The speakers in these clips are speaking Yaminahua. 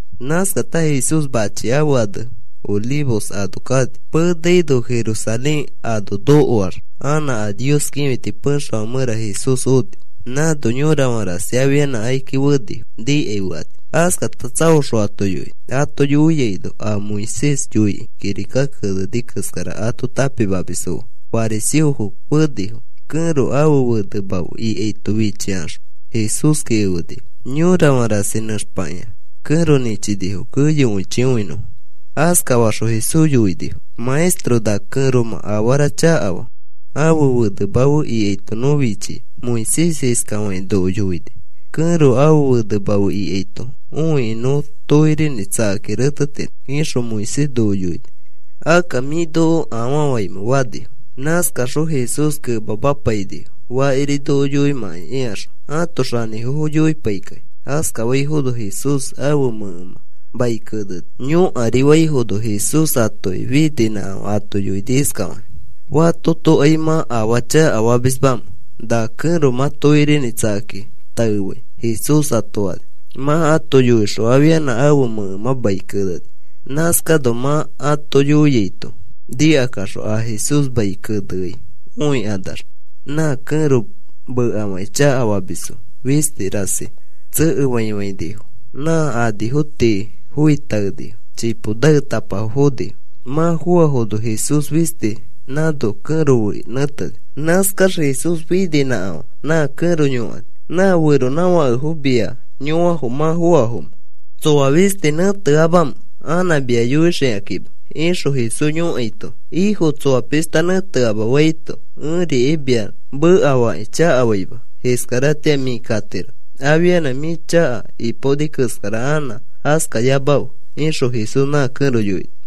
Nãskata Jesús machi ãfe ane Olivos ano kani. Penaino Jerusalén ano nokoax anã a Nios kĩfiti pexefã mẽra Jesús oni. Nãno yorafã rasi afianã akiki fenifo nikai fekani. Askata tsaoxõ ato yoini. Ato yoiaino a Moisés yoikĩ kirika keneni keskara ato tãpimamisfo fe fariseofo fenifo. Kẽro ãfe fenema fe ikaito fichikaxõ Jesúski efenifo. Yorafã rasi nẽxpakĩa kẽro nĩchinifo keyokõichi õinõfo. Askafakaxõ Jesús yoinifo: “Maestro, na kẽromã afarafo chakafaa. Ãfe fenema fe ikaito nõ fichia. Moisés iskafakĩ noko yoini: ‘Kẽro ãfe fenema fe ikaito õikĩ nõ tokirinĩ tsakakĩ retetiro,’ ixõ Moisés noko yoini. Akka, ¿mĩ noko afaa faimẽ?” fanifo. Nãskaxõ Jesús kemamapainifo, “Fakiri noko yoimãkai,” ikaxõ ãto xanĩfofo yoipaikakĩ. Askafaifono Jesús ãfe mẽkemã mai keneni. Yõkarifaifono Jesús atoki fininãkafã ato yoini iskafakĩ: “Fatotokai mã afaa chakafamismamẽ na kẽro mã tokirinĩ tsakakĩ taefai,” Jesús ato fani. Mã ato yoixõ afianã ãfe mẽkemã mai keneni. Nãskano mã ato yoiaito nikakaxõ a Jesús mai keneai õikanax nã kẽro mekafakĩ chakafamisfo fisti rasi tsekefaifãinifo. Nã anifo tii foi taenifo. Chipo naetapafo fonifo. Mã foafono Jesús fisti nãno kẽro fe nẽteni. Nãskax Jesús fininãkafã nã kẽro yõkani: “¿Nã feronãfakefo mia yõafo mã foafomẽ? ¿Tsoa fisti nẽteamamamẽ anã mia yõaxikakĩma?” ixõ Jesús yõkaito, “Ĩfo, tsoa pishta nẽteama,” faito, “Ẽrikai mia mekafakĩ chakafaima. Iskaratĩa mĩ katiro. Afianã mĩ chaka ipaoni keskara anã askayamafe,” ixõ Jesús nã kẽro yoini.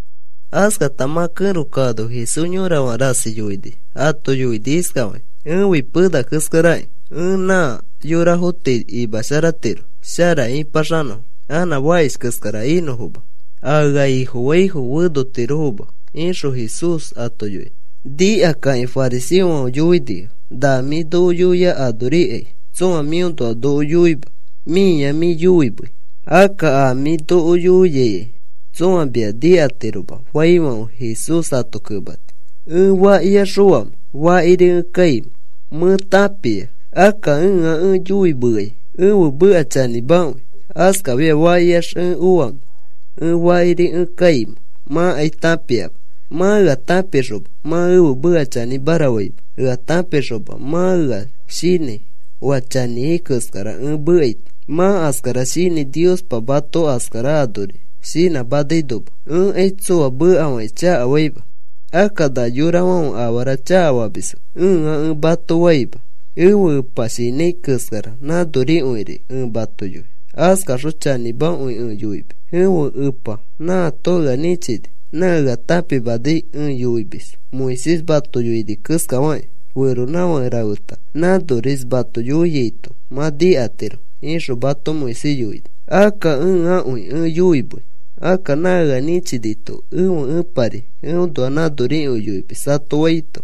Askata mã kẽro kaano Jesús yorafã rasi yoini. Ato yoini iskafakĩ: “Ẽfi pena keskarakĩ. Ẽ nã yorafo tii imasharatiro shara ĩpaxanõfo, anã fakish keskara inõfoma. A ea Ifofai fenotiroma,” ixõ Jesús ato yoini. Nikakakĩ fariseofãfe yoinifo: “Na mĩ noko yoiai anorikai tsõa mĩõnoa noko yoima. Mĩa mĩ yoimei. Akka a mĩ noko yoiaikai tsõa mia nikatiroma,” faifãfe Jesús ato kemani: “Ẽ fakiax oamẽ fakiri ẽ kaimẽ mẽ tãpia. Akka ẽa ẽ yoimeai ẽfe meka chanĩmakõi. Askafiax fakiax ẽ oamẽ ẽ fakiri ẽ kaimẽ mãkai tãpiama. Mã ea tãpixoma, mã ẽfe meka chanĩmara faima. Ea tãpixoma mã ea shinãi oa chanĩai keskara ẽ mekaito. Mã askara shinãi Niospa mato askara anori shinãmanainoma. Ẽkai tsoa mekafakĩ chakafaima. Akka, ‘Na yorafãfe afara chakafamisfo,’ ẽa ẽ mato faima. Ẽfe Epa shinãi keskara nãnorikõiri ẽ mato yoi. Askaxõ chanĩmakõi ẽ yoimis. Ẽfe Epa nãato ea nĩchini, nã ea tãpimanai ẽ yoimis. Moisés mato yoini iskafakĩ: ‘Feronãfake rafeta nãnoris mato yoiaito mã nikatiro,’ ixõ mato Moisés yoini. Akka ẽakõi ẽ yoimei. Akka nã ea nĩchinito ẽfe Ẽpari eõnoa nãnorikõi yoimis,” ato faito,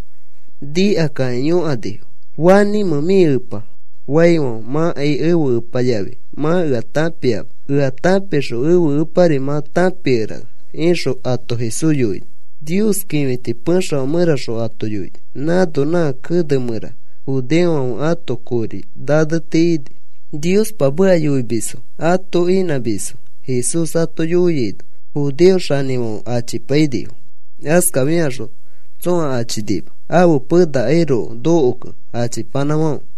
nikakakĩ yõkanifo: “¿Fanĩmẽ mĩ Epa?” faifãfe, “Mãkai ẽfe Epa yafi mã ea tãpiama. Ea tãpixõ ẽfe Epari mã tãpikerana,” ixõ ato Jesús yoini. Nios kĩfiti pexefã mẽraxõ ato yoini. Nãno nã kene mẽra judeofãfe ãto kori naneti ini. Niospa meka yoimisfo ato inãmisfo. Jesús ato yoiaino judeo xanĩfofofãfe achipainifo. Askafixõ tsõa achinima ãfe penakairoko nokokẽ achipanãfãfe.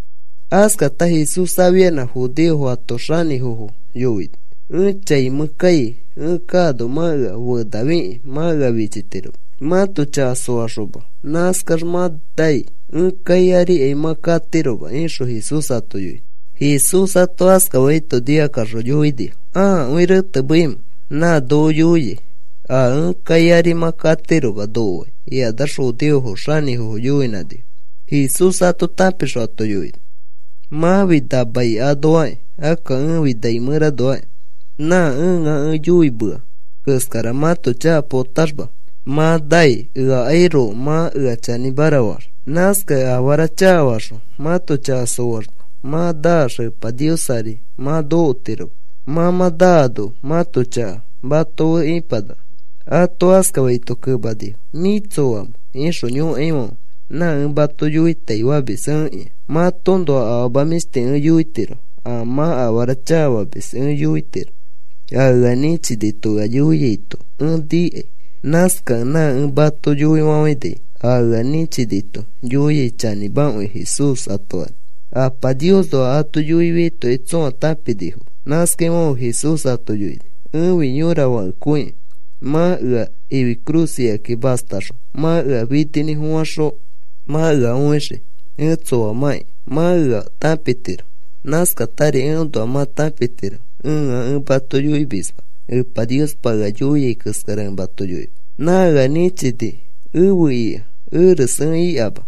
Askata Jesús afianã judeofo ãto xanĩfofo yoini: “Ẽ chai mẽ kai. Ẽ kaano mã ea fenafikĩ mã ea fichitiroma. Mãto chaka soaxoma nãskax mã nai. Ẽ kai arikai mã nokotiroma,” ixõ Jesús ato yoini. Jesús ato askafaito nikakaxõ yoinifo: “¿Akõi retemeimẽ? Nã noko yoiai: ‘A ẽ kai ari mã nokotiroma,’ noko fai,” ikanax judeofo xanĩfofo yoinãnifo. Jesús ato tãpixõ ato yoini: “Mãfi na mai anoakĩ. Akka ẽfi nai mẽranoakĩ. Nã ẽa ẽ yoimea keskara mãto chaka potaxma mã nai eakairoko mã ea chanĩmara faax. Nãskakẽ afara chakafaxõ mãto chaka soaxma mã naax Epa Nios ari mã nokotiroma. Mã mã naano mãto chaka mato fe ipanaka.” Ato askafaito kemanifo: “¿Mĩ tsoamẽ?” ixõ yõkaifãfe, “Nã ẽ mato yoitaifamis ẽkĩa. Matoõnoa afama mĩshti ẽ yoitiro. A mã afara chakafamis ẽ yoitiro. A ea nĩchinito ea yoiaito ẽ nikai. Nãskakẽ nã ẽ mato yoifafãini. A ea nĩchinito yoiai chanĩmakõi,” Jesús ato fani. Apa Niosnoa ato yoifiaitokai tsõa tãpinifoma. Nãskaifãfe Jesús ato yoini: “Ẽfi yõra fakekõiki. Mã ea ifi cruz ikakĩ mastaxõ mã ea fininĩfofãxõ mã ea õixii ẽ tsoamãki mã ea tãpitiro. Nãskatari eõnoa mã tãpitiro ẽa ẽ mato yoimisma. Epa Niospa ea yoia keskara ẽ mato yoimis. Nã ea nĩchini efe ika. Eres ẽ ikama.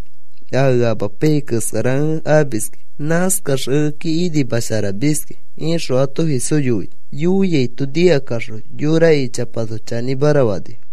A ea amapaiyai keskara ẽ amiski. Nãskax ekeki inimasharamiski,” ixõ ato Jesús yoini. Yoiaito nikakaxõ yora ichapato chanĩmara fanifo.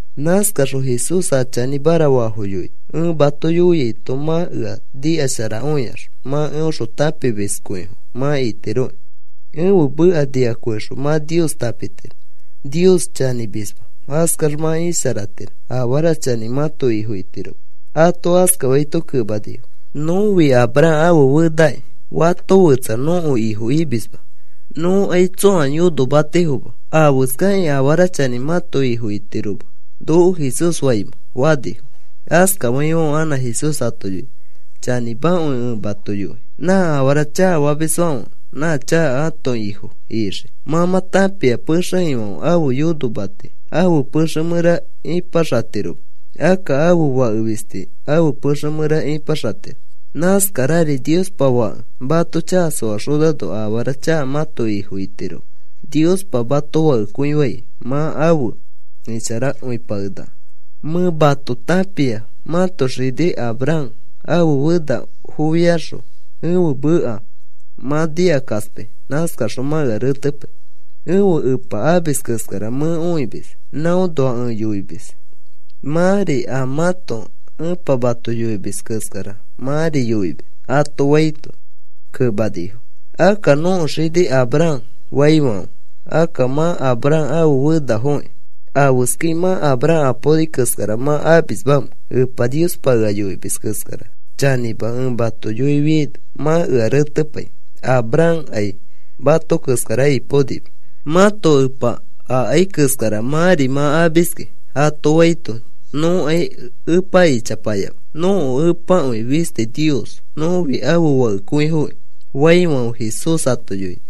Nãskaxõ Jesús a chanĩmara faafo yoini: “Ẽ mato yoiaito mã ea nikasharakõiax mã eõxõ tãpimiskõifo mã itiroki. Ẽfe meka nikakõixõ mã Nios tãpitiro, Nios chanĩmisma. Askax mã isharatiro. Afara chanĩ mãto ifo itiroma.” Ato askafaito kemanifo: “Nõfi Abraham ãfe fenaki. Fato fetsa nõko ifo imisma. Nõkai tsõa yonomatifoma. ¿Afeskakĩ ‘Afara chanĩ mãto ifo itiroma’ noko Jesús faimẽ?” fanifo. Askafaifãfe anã Jesús ato yoini: “Chanĩmakõi ẽ mato yoi. Nã afara chakafamisfãfe nã chaka ãto ifo ixii. Mã mã tãpia pexe ifãfe ãfe yonomati ãfe pexe mẽra ipaxatiroma. Akka ãfe fake fisti ãfe pexe mẽra ipaxatiro. Nãskarari Niospa Fãke mato chaka soaxonano afara chaka mãto ifo itiroma. Niospa mato fakekõifai, mã afe isharakõipakenaka. Mẽ mato tãpia mãto xini Abraham. Ãfe fenafofiaxõ ẽfe meka mã nikakaspai. Nãskaxõ mã ea retepai. Ẽfe Epa amis keskara mẽ õimis. Nãõnoa ẽ yoimis. Mãri a mãto epa mato yoimis keskara mãri yoimis,” ato faito, kemanifo: “Akka nõko xini Abraham,” faifãfe, “Akka mã Abraham ãfe fenafokĩ ¿afeskai mã Abraham apaoni keskara mã amismamẽ? Epa Niospa ea yoimis keskara chanĩma ẽ mato yoifiaino mã ea retepai. Abrahamkai mato keskara ipaonima. Mãto epa akai keskara mãri mã amiski,” ato faito, “Nõkai Epa ichapayama. Nõko Epakõi fisti Nios. Nõfi ãfe fakekõifoki,” faifãfe Jesús ato yoini: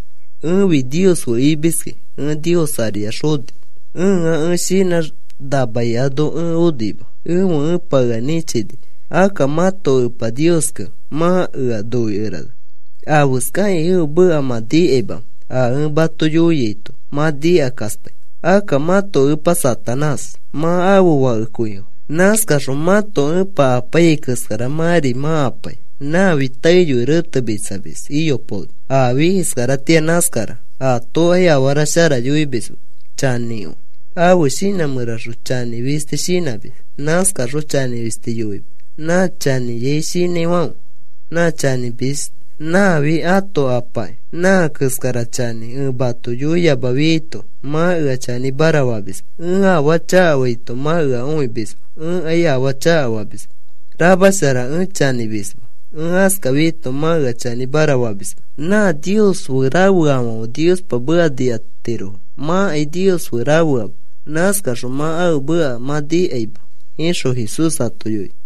“Ẽfi Nios fe imiski. Ẽ Nios ariax oni. Ẽa shinãx na mai ano ẽ onima, ẽfe Ẽpa ea nĩchini. Akka mãto Epa Nioskẽ mã ea noikerana. ¿Afeskakĩ ẽfe meka mã nikaimamẽ? A ẽ mato yoiaito mã nikakaspai. Akka mãto epa Satanás. Mã ãfe fakekõifo. Nãskaxõ mãto epa apaiyai keskara mãri mã apai. Nãfi taeyoi retemitsamis iyopaoni. Afi iskaratĩa nãskara. Atokai afara shara yoimisma, chanĩkõi. Ãfe shinã mẽraxõ chanĩ fisti shinãmis. Nãskaxõ chanĩ fisti yoimis. Nã chanĩai shinãifãfe nã chanĩmis nãfi ãto apaki. Nã keskara chanĩ ẽ mato yoiyamafiaito mã ea chanĩmara famisma. Ẽ afaa chakafaito mã ea õimisma. Ẽkai afaa chakafamisma. Ramashara ẽ chanĩmisma. Ẽ askafiaito mã ea chanĩmara famisma. Nã Nios fe rafeafãfe Niospa meka nikatirofo. Mãkai Nios fe rafeama. Nãskaxõ mã ãfe meka mã nikaima,” ixõ Jesús ato yoini.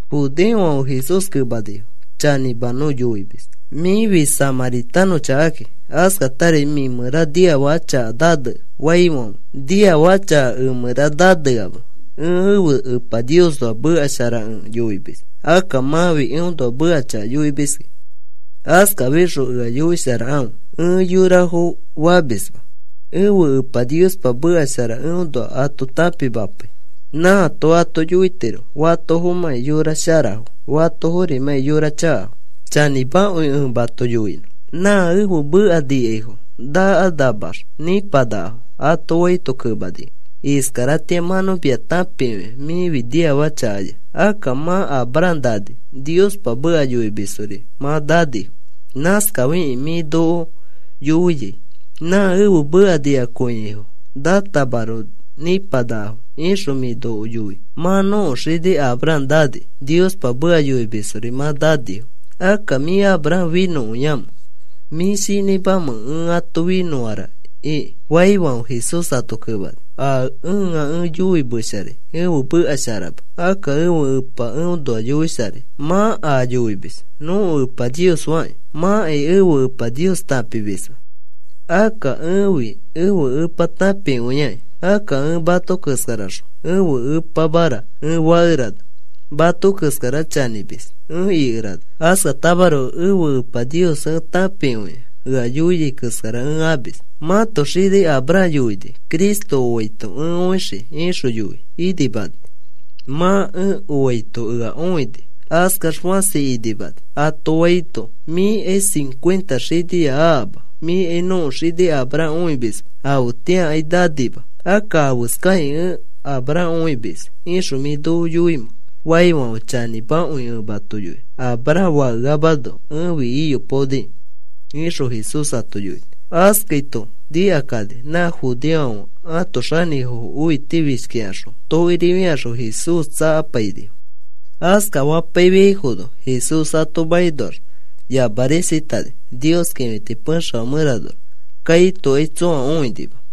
Judeofãfe Jesús kemanifo: “Chanĩma nõ yoimis. Mĩfi samãritanõ chakaki. Askatari mĩ mẽra niafaka chaka nanea,” faifãfe, “Niafaka chaka ẽ mẽra naneama. Ẽ ẽfe Epa Niosnoa meka shara ẽ yoimis. Akka mãfi eõnoa meka chaka yoimis. Askafixõ, ‘Ea yoisharakãfe,’ ẽ yorafo famisma. Ẽfe Epa Niospa meka shara eõnoa ato tãpimapai. Nãato ato yoitiro fatofomãki yora sharafo, fatoforimãki yora chakafo. Chanĩmakõi ẽ mato yoinõ. Nã ẽfe meka nikaifo nakanamax nĩpanakafo,” ato faito kemanifo, “Iskaratĩa mã nõ mia tãpikõi mĩfi niafaka chakaya. Akka mã Abraham nani, Niospa meka yoimisfori mã nanifo. Nãskafikẽ mĩ noko yoia: ‘Nã ẽfe meka nikakõiaifo nãtamaroko nĩpanakafo,’ ixõ mĩ noko yoi. Mã nõko xini Abram nani. Niospa meka yoimisfori mã nanifo. ¿Akka mĩ Abram finõkõiamẽ? ¿Mĩ shinãimẽ ‘Ẽ ato finõara’ iki?” faifãfe, Jesús ato kemani: “A ẽa ẽ yoimesharai ẽfe meka sharama. Akka ẽfe Ẽpa eõnoa yoisharai. Mã a yoimis: ‘Nõko Epa Nios,’ fakĩ. Mãkai ẽfe Epa Nios tãpimisma. Akka ẽfi ẽfe Epa tãpikõia. Akka ẽ mato keskaraxõ, ‘Ẽfe Epamara,’ ẽ fakerana mato keskara chanĩmis ẽ ikerana. Askatamaroko ẽfe Epa Nios ẽ tãpikõia. Ea yoiai keskara ẽ amis. Mãto xini Abram yoini: ‘Cristo oaito ẽ õixii,’ ixõ yoi inimani. Mã ẽ oaito ea õini askax fãsi inimani,” ato faito, “Mĩkai cincuenta xiniya akama. Mĩkai nõko xini Abram õimisma. Afetĩakai nanima. Akka, ¿afeskakĩ, ‘Ẽ Abram õimis,’ ixõ mĩ noko yoimẽ?” faifãfe, “Chanĩmakõi ẽ mato yoinõ. Abram fakeamano ẽfi iyopaoniki,” ixõ Jesús ato yoini. Askaito nikakani nã judeofãfe ãto xanĩfofo õitifishkikaxõ tokiri fikaxõ Jesús tsakapainifo. Askafapaifiaifono Jesús ato makinoax yamarisatani, Nios kĩfiti pexefã mẽranoax. Kaitokai tsõa õinima.